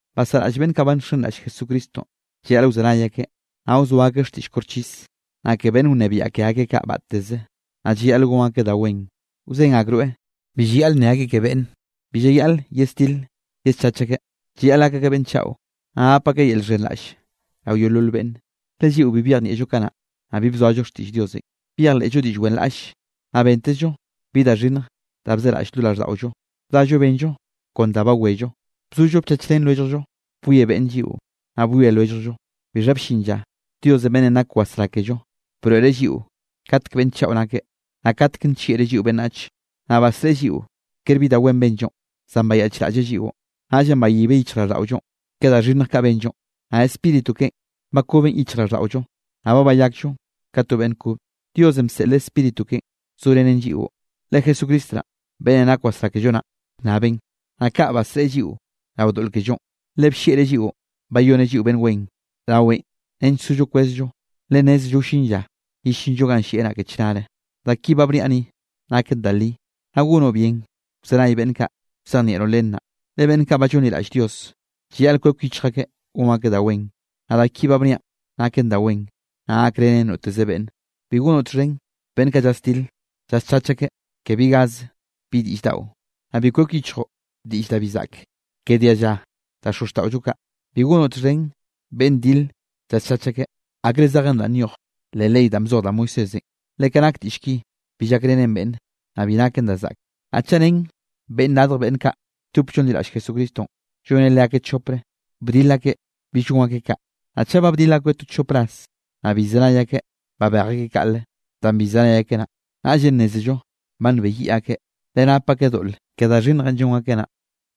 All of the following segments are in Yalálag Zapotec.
Basaꞌraꞌll beꞌnn kaꞌ ba nxenraꞌll Jesucristonꞌ, llayaꞌl wzenay akeꞌ, naꞌ wzoa akeꞌ xtiꞌll koxchis, naꞌ ke beꞌnn wnebiaꞌ ke akeꞌ kaꞌ batteze, naꞌ llayaꞌl gon akeꞌ da wen. Wzen akroeꞌ bi llayaꞌl nne akeꞌ ke beꞌnne. Bi llayaꞌl yesdile yeschach akeꞌ, llayaꞌl gak akeꞌ beꞌnn chaꞌo, naꞌ gap akeꞌ yel llxhenraꞌll rao yeolol beꞌnne. Le lliꞌo bi byejnieꞌllo kanaꞌ, naꞌ bi bzoallo xtiꞌll Diosenꞌ. Byejleꞌllo diꞌll wenraꞌlle, naꞌ bentezllo bi da xhinnje da bzeraꞌll lo raꞌlldaꞌollo. Bdallo benllo kon da bawello. Bzollo bchachrén lwelljllo. Bwie beꞌnne lliꞌo, naꞌ bwie lwelljllo. Bixha bllin lla Diosenꞌ beꞌnnenꞌ nak wasrá kello, broeꞌreꞌ lliꞌo katek beꞌnn chaꞌo nakeꞌ, naꞌ katek nllieꞌreꞌ lliꞌo beꞌnnach. Naꞌ basreꞌe lliꞌo kere bi da wen benllo, zan bayaꞌchraꞌlleꞌ lliꞌon. Naꞌllenꞌ bayibeꞌ yichjraꞌlldaꞌollonꞌ ke da xhinnj kaꞌ benllo, naꞌ Spíritu keꞌen bakoben yichjraꞌlldaꞌollonꞌ, naꞌ ba bayakllo ka to beꞌnn kobe. Diosenꞌ bseꞌleꞌ Spíritu keꞌen zorenen lliꞌo, le Jesucristo naꞌn beꞌnnenꞌ nak wasrá kello naꞌ bnnabeꞌn. Naꞌ kaꞌ basreꞌe lliꞌo rao doꞌl kellonꞌ, le bllieꞌreꞌ lliꞌon bayoneꞌ lliꞌo beꞌnn wen raweꞌn nench sollo kwezllo, le nnézello wllin lla yellinllo ganꞌ llieꞌ naꞌ ke chnare. Da ki ba bniaꞌ ni, naken da li, naꞌ gonoꞌ bien wzenay beꞌnn kaꞌ, wzejnieꞌroꞌn len naꞌ. Le beꞌnn kaꞌ ba llonliraꞌll Dios, llayaꞌl kwek yichj akeꞌ gon akeꞌ da wen. Naꞌ da ki ba bniaꞌn naken da wen, naꞌ gakrenen noteze beꞌnne. Bi gonoꞌ txhen beꞌnn kaꞌ llasdil llaschach akeꞌ ke bi gaze bi diꞌll daꞌo. Naꞌ bi kwek yichjoꞌ diꞌll da bi zaꞌke ke dialla da xozxtaꞌollo kaꞌ. Bi gonoꞌ txhen beꞌnn dile llaschach akeꞌ, akre zejen danꞌ nyoj leꞌ ley danꞌ bzoj da Moisésenꞌ, le ka nak diꞌll ki, bi llakrenen beꞌnne, naꞌ bi naken da zaꞌke. Naꞌ chaꞌ ren beꞌnn radj beꞌnn kaꞌ lldop llonliraꞌll Jesucristonꞌ, lloneꞌ leakeꞌ chopre, bdil akeꞌ bill gon akeꞌ kaꞌ, naꞌ chaꞌ ba bdil akoeꞌ to chop ras, naꞌ bi llzenay akeꞌ, babej akeꞌ kaꞌle. Danꞌ bi llzenay akeꞌ naꞌ, naꞌllenꞌ nnézello ba nbeyiꞌ akeꞌ, le nap akeꞌ doꞌl ke da xhinnjenꞌ llon akeꞌ naꞌ.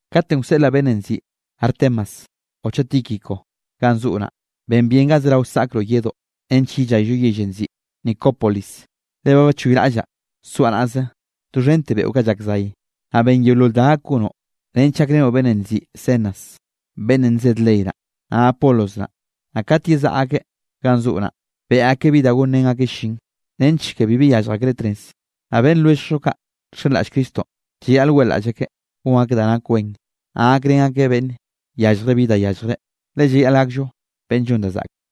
Kate wseꞌlaꞌ beꞌnnenꞌ nziꞌi Artemas o chaꞌ Tíquico ganꞌ zoꞌo naꞌ, ben bien ga zerao saꞌkroꞌ yedoꞌ, nench yellayllo yellenꞌ nziꞌi Nicópolis, le ba bachoyraꞌllaꞌ soaꞌ naꞌze doxhente beꞌo kaꞌ llak zay. Naꞌ ben yeolol da gak gonoꞌ, nench gakrenoꞌ beꞌnnenꞌ nziꞌi Zenas, beꞌnnenꞌ nzed ley naꞌ, naꞌ Apolos naꞌ, naꞌ kat yezaꞌa akeꞌ ganꞌ zoꞌo naꞌ, beꞌe akeꞌ bi da gonrén akeꞌ llin, nench ke bi yallj akreꞌ tnez. Naꞌ beꞌnn lwelljllo kaꞌ nxenraꞌll Cristonꞌ, llayaꞌl weꞌlaꞌll akeꞌ gon akeꞌ da nak wen, naꞌ gakrén akeꞌ beꞌnn yallje bi da yalljreꞌ. Le llayaꞌl gakllo beꞌnn llon da zaꞌke.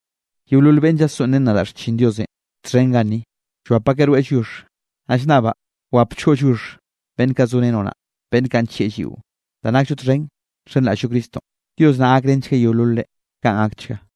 Yeolol beꞌnne llasoꞌnrén nadaꞌ xchin Diosenꞌ txhen ganni, llwap akeꞌ rweꞌ lliox. Naꞌ llnnabaꞌ wapchgoꞌ lliox beꞌnn kaꞌ zorenoꞌ naꞌ, beꞌnn kaꞌ nllieꞌ lliꞌo, danꞌ nakllo txhen nxenraꞌll-llo Cristonꞌ. Dios naꞌ gakrenchgueꞌ yeololre. Kaꞌn gakchga.